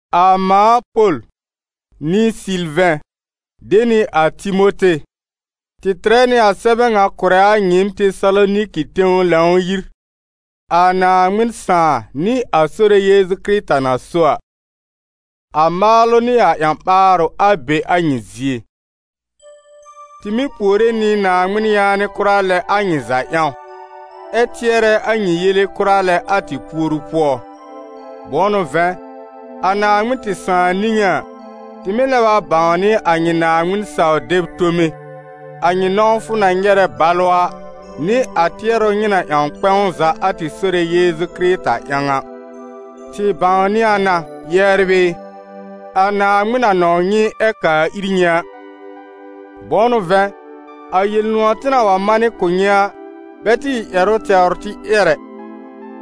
A mãa Pol, nɩ Sɩlvɛ̃, de nɩ a Timote, tɩ tɩrɛ nɩ a sɛbɛ ŋa kʋ̀rɛ a nyɩɩm Tesaloniki tẽw Lãw-yir, a Naaŋmɩn Sãà nɩ a Sore Yeezu Kɩrɩta na so a. A maalʋ nɩ a ƴã-ɓaarʋ, a be a nyɩ zie. Tɩ mɩ́ puore nɩ Naaŋmɩn yaanɩ kʋra lɛ a nyɩ za ƴãw, ɛ tɩɛrɛ a nyɩ yele kʋra lɛ a tɩ puoru pʋɔ. Bʋ̃ʋ n'ʋ vɛ̃, a Naaŋmɩn tɩ Sãà niŋé a, tɩ mɩ́ lɛb a bãwnɩ a nyɩ Naaŋmɩn-saw-deb tome, a nyɩ nɔ̃wfʋ na nyɛrɛ balʋ a, nɩ a tɩɛrʋ nyɩ na ƴãw kpɛ̃w za a tɩ Sore Yeezu Kɩrɩta ƴãw a. Tɩ bãwnɩ a na, yɛbr ɩ, a Naaŋmɩn na nɔ̃w nyɩ ɛ kaa ir nyɩ a. Bʋ̃ʋ n'ʋ vɛ̃, a Yel-nʋ̃ɔ̀ tɩ na wa manɩ kʋ̀ nyɩ a, bɛ tɩ ɩ ƴɛrʋ tɛwr tɩ ƴɛr ɛ,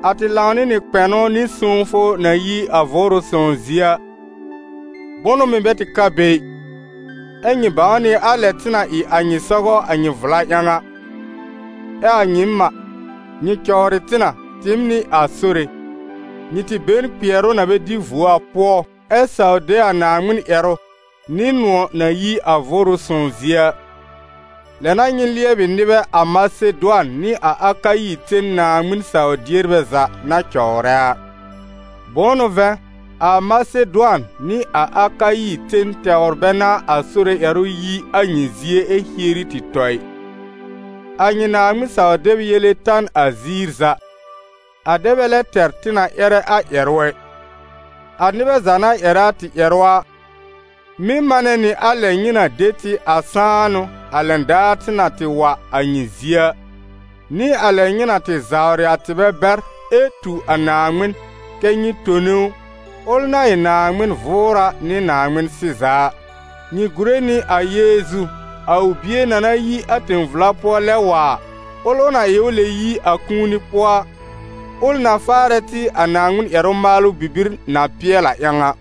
a tɩ lãw nɩ nɩ kpɛnʋ nɩ sõwfʋ na yi a Vʋʋrʋ Sõw zie a, bʋnʋ mɩ̀ bɛ tɩ ka be ɩ. Ɛ nyɩ bãw nɩ a lɛ tɩ na ɩ a nyɩ sɔgɔ a nyɩ vla ƴãw a. Ɛ a nyɩɩm a, nyɩ cɔwrɩ tɩ na, tɩɩm nɩ a Sore, nyɩ tɩ be n kpɩɛrʋ na bɛ dɩ vuo a pʋɔ, ɛ saw de a Naaŋmɩn ƴɛrʋ, nɩ nʋ̃ɔ̀ na yi a Vʋʋrʋ Sõw zie a. Lɛ n'a nyɩ lɩɛbɩ nɩbɛ a Masedʋan nɩ a Akayi ten Naaŋmɩn saw-dierbɛ za na cɔwrɛ a. Bʋ̃ʋ n'ʋ vɛ̃, a Masedʋan nɩ a Akayi ten tɛwr bɛ n'a a Sore ƴɛrʋ yi a nyɩ zie ɛ hieri tɩ tɔ ɩ, a nyɩ Naaŋmɩn saw-deb yele ta n a ziir za, a dɛ bɛ lɛ tɛr tɩ na ƴɛrɛ a ƴɛrʋ ɛ. A nɩbɛ za na ƴɛrɛ a tɩ ƴɛrʋ a, mɩ́ manɛ nɩ a lɛ nyɩ na de tɩ a sãanʋ a lɛn daar tɩ na tɩ wa a nyɩ zie a, nɩ a lɛ nyɩ na tɩ zawrɩ a tɩbɛ bɛr ɛ tu a Naaŋmɩn, kɛ́ nyɩ tone ʋ, ʋl na ɩ Naaŋmɩn-vʋʋra nɩ Naaŋmɩn-sɩza a. Nyɩ gùre nɩ a Yeezu, a ʋ Bie na na yi a tẽ-vla pʋɔ lɛb wa a, ʋl ʋ na ɩ k'ʋ lɛb yi a kũuni pʋɔ a, ʋl na faarɛ tɩ a Naaŋmɩn ƴɛrʋ maalʋ bibir na pɩɛl a ƴãw a.